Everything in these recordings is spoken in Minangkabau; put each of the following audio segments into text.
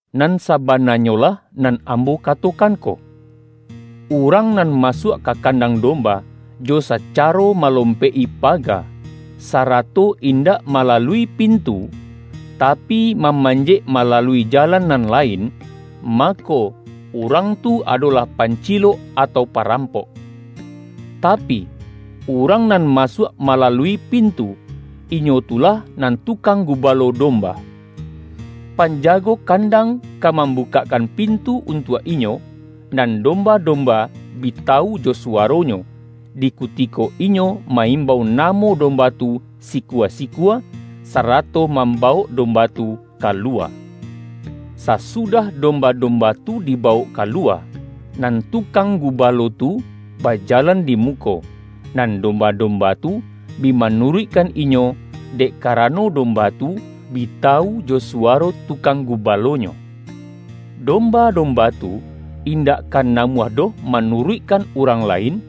”Nan sabananyo lah nan Ambo katokan ko: Urang nan masuak ka kandang domba, jo sacaro malom-pek-i paga, sarato indak malalui pin-tu, tapi, mamanjek malalui jalan nan lain, mako, urang tu adolah pancilok atau parampok. Tapi, urang nan ma-suak malalui pintu, inyo tu lah nan tukang gubalo domba. Panjago kan-dang ka mambukakkan pintu untuak inyo, nan domba-domba bi tawu jo suwaronyo, di kutiko inyo ma-imbau namo domba tu sikua-sikua, sarato mambawok domba tu kaluwa. Sasu-dah domba-domba tu dibawok kalu-wa, nan tukang gubalo tu bajalan di muko, nan domba-domba tu bi ma-nuruikkan inyo, dek karano domba tu bi tawu jo suwaro tukang gubalo-nyo. Domba-domba tu, indak ka na-muah doh manuruikkan urang lain,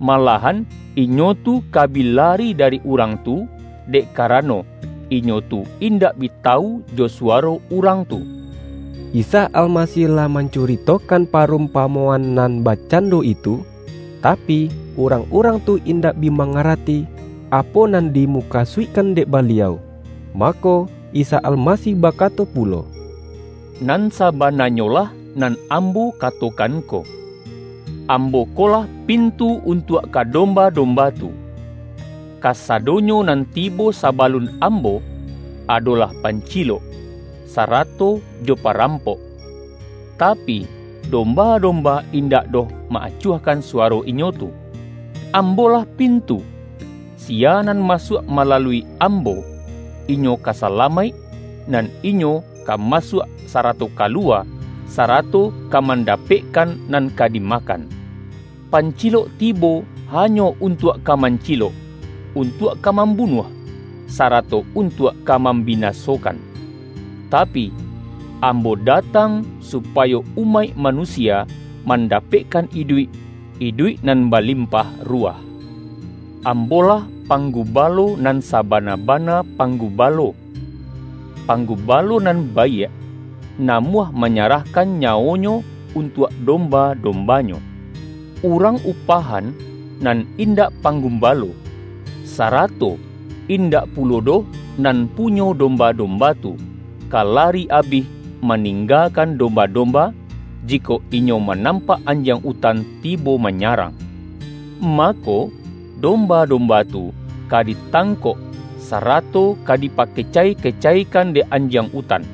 malahan inyo tu ka bi lari dari urang tu, dek karano, inyo tu indak bi tawu jo suwaro urang tu.” Isa Almasih lah mancuritokan pa-rumpamoan nan bakcando itu, tapi, urang-urang tu indak bi mangarati, apo nan dimukasuikkan dek Baliau. Mako, Isa Almasih bakato pulo,”Nan sabananyolah nan Ambo kato-kan ko: Ambo ko lah pintu untuak ka domba-domba tu. Kasadonyo nan tibo sabalun Ambo, adolah pancilok, sarato jo parampok, tapi, domba-domba indak doh ma-acuahkan suwaro inyo tu. Am bo-lah pintu. Siya nan masuak malalui Ambo, inyo ka salamaik, nan inyo ka masuak, sarato kaluwa, sarato ka man-dapekkan nan ka dimakan. Pancilok tibo hanyo untuak ka mancilok, untuak ka mambunuah, sarato untuak ka mam binasokan. Tapi, Ambo datang supayo umaik manusia mandapekkan iduik — iduik nan balimpah ruwah. Ambo-lah Panggubalo, nan sa-bana-bana Panggubalo. Panggubalo nan baiak, namuah manyarahkan nyawonyo untuak domba-dombanyo. Urang upahan, nan indak Panggu-balo, sarato indak pulo doh nan pu-nyo domba-domba tu, ka lari abih ma-ninggakan domba-domba, jikok inyo manampak anjiang utan tibo manya-rang. Mako, domba-domba tu ka di-tangkok, sarato ka dipakecai-kecaikan dek anjiang utan.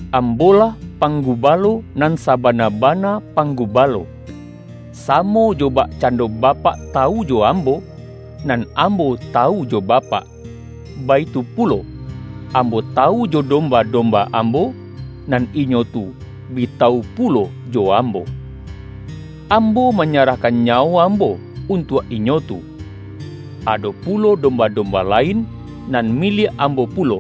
Am-bo-lah Panggubalo, nan sabana-bana Panggubalo. Samo jo bakcando Bapak tawu jo Ambo, nan Ambo tawu jo Ba-pak, baitu pulo Ambo tawu jo dom-ba-domba Ambo, nan inyo tu bi tawu pulo jo Ambo. Ambo manyarahkan nyawo Ambo untuak inyo tu. Ado pulo domba-domba lain, nan miliak Ambo pulo,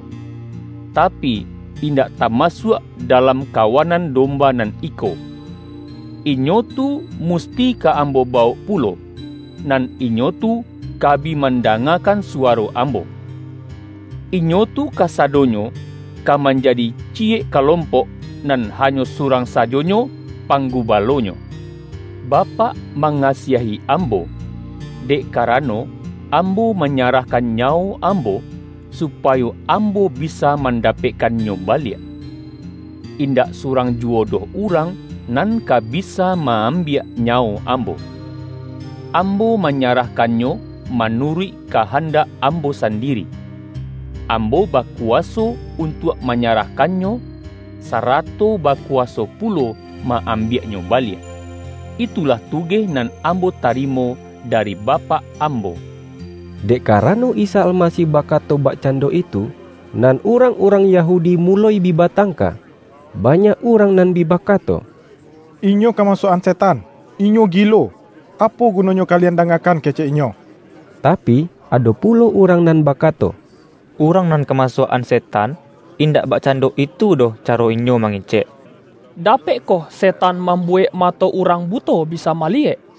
tapi, indak tamasuak da-lam kawanan domba nan iko. Inyo tu musti ka Ambo bawok pulo, nan inyo tu ka bi mandangakan suwaro Ambo. Inyo tu kasadonyo ka manjadi ciyek kalompok, nan hanyo surang sajonyo Panggubalonyo. Bapak mangasiahi Ambo, dek ka-rano, Ambo manyarahkan nyawo Am-bo, supayo Ambo bisa mandapekkan-nyo baliak. Indak surang juwo doh urang nan ka bisa ma-ambiak nyawo Ambo. Ambo manyarahkannyo manu-ruik kahandak Ambo sandiri. Ambo bakuwaso untuak manyarahkannyo, sarato bakuwaso pulo ma-ambiaknyo baliak. Itulah tugeh nan Ambo tari-mo dari Bapak Ambo.” Dek karano Isa Almasih bakato bakcando itu, nan urang-urang Yahu-di muloi bi batangka. Banyak urang nan bi bakato,”Inyo kamasuak-an se-tan! Inyo gilo! Apo gunonyo kalian da-ngakan kecek Inyo?” Tapi, ado pulo urang nan bakato,”Urang nan kamasuak-an setan, in-dak bakcando itu doh caro inyo mangecek! Dapekkoh setan mambuwek mato urang buto bisa maliyek?”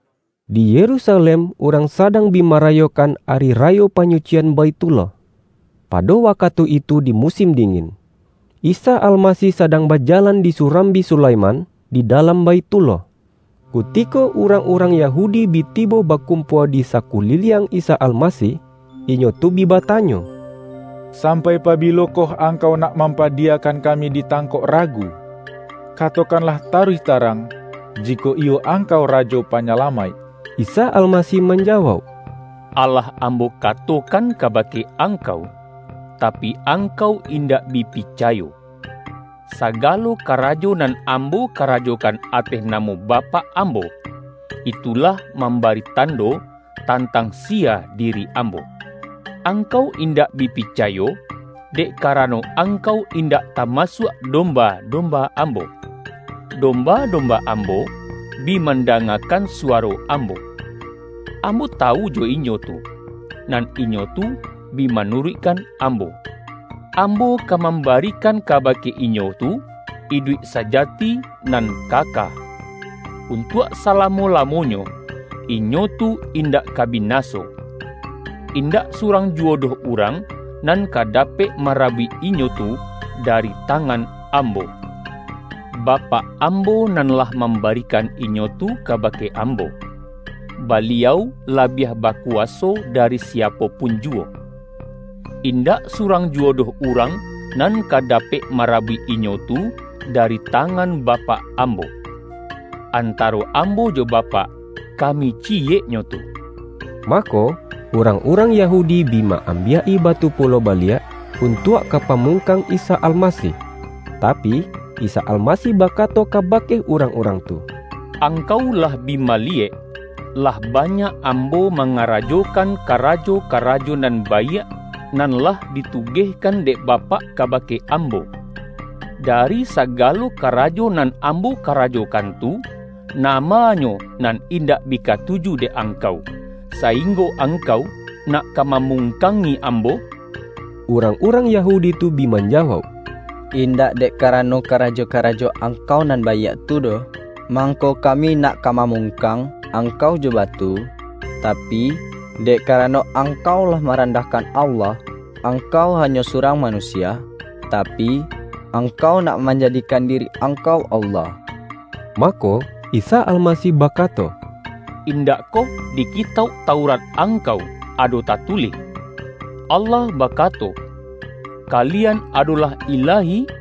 Di Yerusalem urang sadang bi marayokan, Ari Rayo Panyucian Baithullah. Pado wakatu itu di mu-sin dingin. Isa Almasih sadang ba-jalan di Surambi Sulaiman, di dalam Baithullah. Kutiko urang-urang Ya-hudi bi tibo bakumpua di sakuliliang Isa Almasih, inyo tu bi batanyo,”Sam-pai pabilokoh Angkau nak mampadi-yakan kami ditangkok ragu? Katokan-lah taruih tarang, jikok iyo Angkau Rajo Panyalamaik.” Isa Almasih manjawauk,”Alah Ambo katokan kabake angkau, tapi angkau indak bi picayo. Sagalo ka-rajo nan Ambo karajokan ateh namo Bapak Ambo, itu lah mambari tando, tantang siya diri Ambo. Angkau in-dak bi picayo, dek karano angkau in-dak tamasuak domba-domba Ambo. Domba-domba Ambo, bi mandanga-kan suwaro Ambo. Ambo tawu jo inyo tu, nan inyo tu bi manuruikkan Ambo. Ambo ka mambarikan kabake inyo tu, iduik sajati nan kaka. Untuak sala-mo-lamonyo, inyo tu indak ka binaso. Indak surang juwo doh urang nan ka dapek marabuik inyo tu dari tangan Ambo. Bapak Ambo nan lah mam-barikan inyo tu kabake Ambo. Baliau labiah bakuwaso dari siapo pun juwo. Indak surang juwo doh urang nan ka dapek marabuik inyo tu dari tangan Bapak Ambo. Antaro Ambo jo Ba-pak, Kami ciyeknyo tu.” Mako, urang-urang Yahudi bi ma-ambiak-i batu pulo baliak, untuak ka pamungkang Isa Almasih. Tapi, Isa Almasih bakato kabake urang-urang tu,”Angkau lah bi maliyek, lah ba-nyak Ambo mangarajokan karajo-karajo nan baiak, nan lah ditugehkan dek Bapak kabake Ambo. Dari sagalo karajo nan Ambo karajokan tu, nama-nyo nan indak bi katuju dek angkau, sainggo angkau nak ka mamungkangi Ambo?” Urang-urang Yahudi tu bi manja-wauk,”Indak dek karano karajo-karajo Angkau nan baiak tu doh, mangko kami nak ka mamungkang Angkau jo batu, tapi, dek karano Angkau lah ma-randahkan Allah. Angkau hanyo su-rang manusia, tapi, Angkau nak man-jadikan diri Angkau Allah.” Mako, Isa Almasih bakato,”In-dakkoh di Kitauk Taurat angkau ado tatulih: Allah bakato, ’Kalian adolah ilahi'?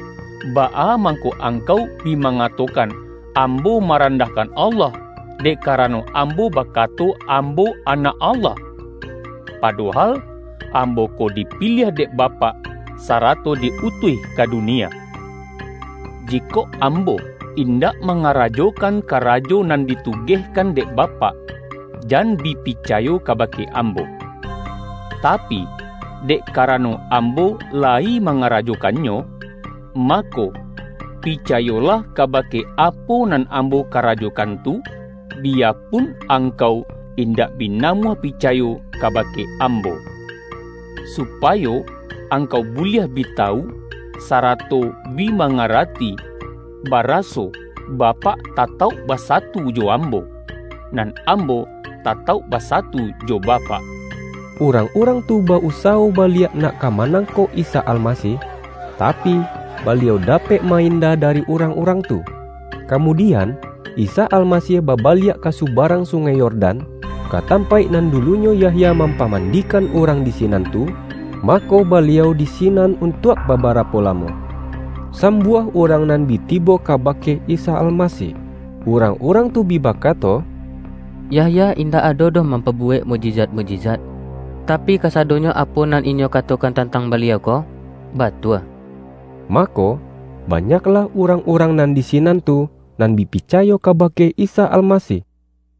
baa mangko angkau bi mangatokan Ambo marandahkan Allah, dek ka-rano Ambo bakato Ambo Anak Allah? Padohal, Ambo ko dipiliah dek Bapak, sarato di utuih ka dunia. Jikok Ambo indak mangarajokan, karajo nan ditugehkan dek Bapak, jan bi picayo kabake Ambo. Tapi, dek karano Ambo layi mangarajokan-nyo, mako, picayolah kabake apo nan Ambo karajokan tu, biyapun angkau indak bi namuah picayo kabake Ambo. Supayo angkau buliah bi tawu, sara-to bi mangarati, baraso Bapak tatauk basatu jo Ambo, nan Ambo tatauk ba-satu jo Bapak.” Urang-urang tu ba-usawo baliak nak ka manangkok Isa Almasih, ta-pi, Baliau dapek ma-inda dari urang-urang tu. Kamudian, Isa Almasih babaliak ka subarang Sungai Yordan, ka tam-paik nan dulunyo Yahya mampaman-dikan urang di sinan tu, mako, Ba-liau di sinan untuak babarapo lamo. Sambuah urang nan bi tibo kabake Isa Almasih. Urang-urang tu bi baka-to,”Yahya indak ado doh mampabuwek mukjizat-mukjizat, tapi kasadonyo apo nan inyo katokan tantang Baliau ko, batua.” Mako, banyaklah urang-urang nan di sinan tu, nan bi picayo kabake Isa Almasih. YAHYA